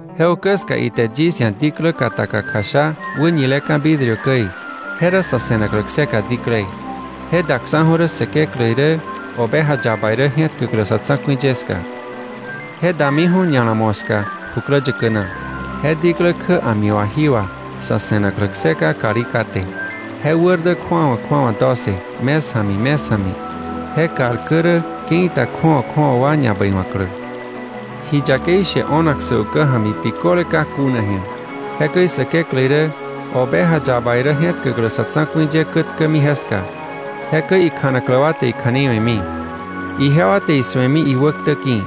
Je ukä ska ite yis ia̱ diklä kataka kjasha wäñileka̱ vidrio käi, je rä sa̱ se̱naklä kseka diklei. Je daksa̱ju̱ rä Säkeklä irä Oveja Yaba irä je̱tkäklä sa̱ tsa̱ku̱i ye ska. Je damiju̱ ña̱la moska jukläyäkä na. Je diklä kjä a̱mi wà, jí wà, sa̱ se̱naklä kseka kalí kate. Je wär dä kju̱awa kju̱awa doce, mes ja̱mi, mes ja̱mi. Je kal kä rä ke̱i ta kju̱awa kju̱awa wa ñabäiwa̱klä. Ji yakei she o̱nak sä ukä ja̱mi biköle ka kuna ji̱a. Jekäi Säkeklä irä Oveja Yaba irä je̱tkäklä sa̱ tsa̱ku̱i ye kätkämi jeska, jekäi ikjanaklä wa te ikja̱nei we̱mi. Ijewa te isu̱emi iwäktä ki̱.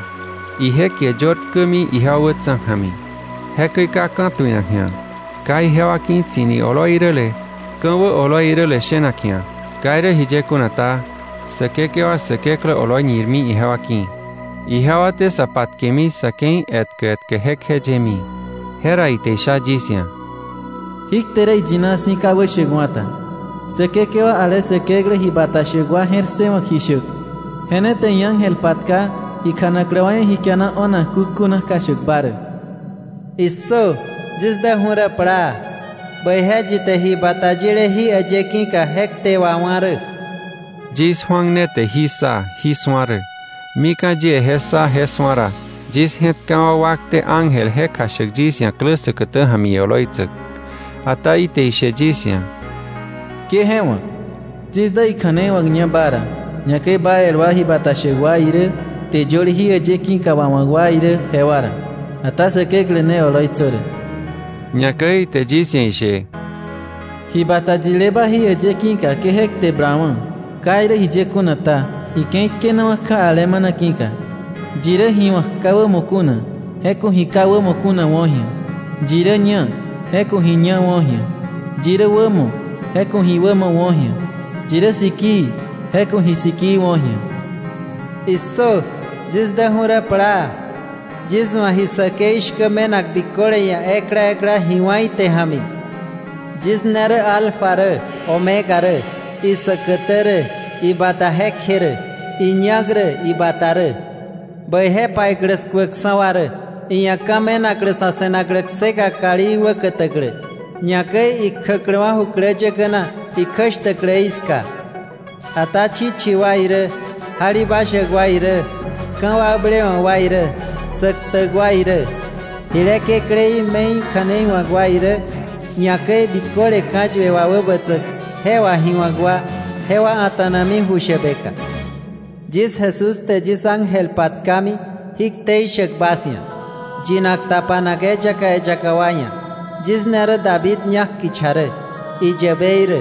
Ije kie yör tkämi ijewa wätsa̱ ja̱mi. Jekäi ka ka̱tuinak ji̱a, ka ijewa ki̱ tsi̱ni oloi iräle, ka̱wä oloi iräle, shenak ji̱a. Ka irä jiye kuna ta, Säkekewa Säkeklä oloi ñirmi ijewa ki̱. Ijewa te sa patkemi sa̱ ke̱i etkä etkä jekjeyemi. Jera ite isha yis ia̱: “Jí kte rä iyina si̱, ka wäshäkwa̱ ta. Säkekewa ale Säkeklä ji bata shäk wa je̱r ssëwa̱k ji shäk, je ne te iángel patka ikjanaklä wa ia̱ ji kiana o̱nak kukjuna kjashäkba rä.” “¡Issö! ¡Yis däju̱ rä plaa! ¡Bäije yi te ji bata yile jí äyë ki̱ka je kte wawá̱ rä!” Yis Juan ne te jí ssa, jí su̱a rä. Mika̱ yie je ssa je su̱a ra, yis je̱tkawa̱ wakte ángel je kjashäk yis ia̱ klä säkätä ja̱mi ioloitsäk. Ata ite ishe yis ia̱: “Ke je wa̱k. Yis dä ikja̱nei wa̱kña ba ra, ñakäi ba el wa ji bata shäk wa irä, kte yöle jí äyë ki̱ka wawa̱k wa irä, jewa ra. Ata Säkeklä ne oloitsö rä.” Ñakäi ite yis ia̱ ishe: “Ji bata yileba jí äyë ki̱ka ke je kte blawa̱. Ka irä jiye kuna ta, ike̱i tkenawa̱ kja alemana ki̱ka. Yi rä ji wa̱k ka wämo kuna, je ku̱ ji ka wämo kuna wo̱ ji̱a. Yi rä ñá, je ku̱ ji ñá wo̱ ji̱a. Yi rä wämo, je ku̱ ji wämo wo̱ ji̱a. Yi rä sikii, je ku̱ ji sikii wo̱ ji̱a.” “¡Issö! Yis däju̱ rä plaa. Yis wa̱ ji säkei shkä me̱nak biköle ia̱ ekla ekla, ji wá̱ ite ja̱mi. Yis ne rä ‘Alfa’ rä, ‘Omega’ rä, isäkätä rä, ibata jekje rä, iñak rä, ibata rä. “Bäije paiklä skuäkksa̱ wa rä, iia̱ ka̱ me̱naklä sa̱ se̱naklä kseka kalí wä kätäklä, ñakäi ikjäkläwa̱ jukläyäkä na ikjäshtäkläí ska. Ata chichi wa irä, jalibashäk wa irä, ka̱wakblewa̱k wa irä, sä ktäk wa irä, jile kekläí me̱i kja̱nei wa̱k wa irä, ñakäi biköle ka̱yue wà wäbätsäk, je wà ji wa̱k wa, jewa a̱ta̱nami ju shäbeka. “Yis Jesús te yis ángel patkami jí ktei shäk bas ia̱, yinak tapanak eyaka eyaka wa ia̱. Yis ne rä David ñak kicha rä, iyäbei rä,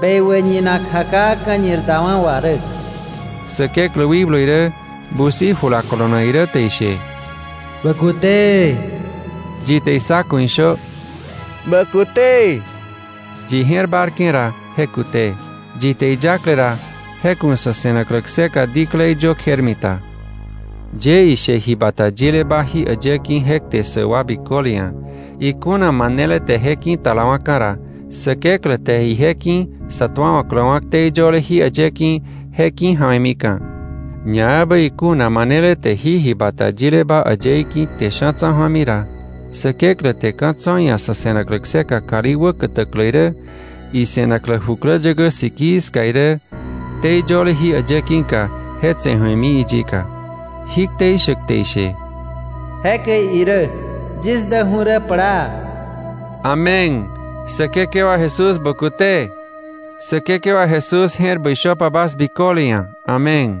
bekwä ñinak jakaa ka̱ñir dawa̱ wà rä.” Säkeklä wikblu irä busi jula kolonak irä te ishe: “¡Bä kute!” Yi te issa ku̱ ishö: “¡Bä kute!” Yi je̱r bárke̱ ra, je kute. Yi te iyákle ra, je ku̱ sa̱ se̱naklä kseka diklei yö kjermita. Yie ishe ji bata yileba jí äyë ki̱ je kte ssäk wa biköle ia̱: Ikuna manele te je ki̱talawa̱ka̱ ra, Säkeklä te ije ki̱ sa tuawa̱kläwa̱ ktei yöle jí äyë ki̱, je ki̱ja̱we̱mika̱. Ñaebä ikuna manele te jí ji bata yileba äyëí ki̱ kte sha̱ tsa̱ ju̱ami ra, Säkeklä te ka̱ tso̱ iia̱ sa̱ se̱naklä kseka kalí wä kätäklä irä, ise̱naklä jukläyäkä sikii ska irä, ktei yöle jí äyë ki̱ka, je tse̱ ju̱emi iyika. Jí ktei shäk te ishe: “Jekäi irä. Yis däju̱ rä plaa.” Amén. ¡Säkekewa Jesús, bä kute! Säkekewa Jesús je̱r bäi shöpa bas biköle ia̱. Amén.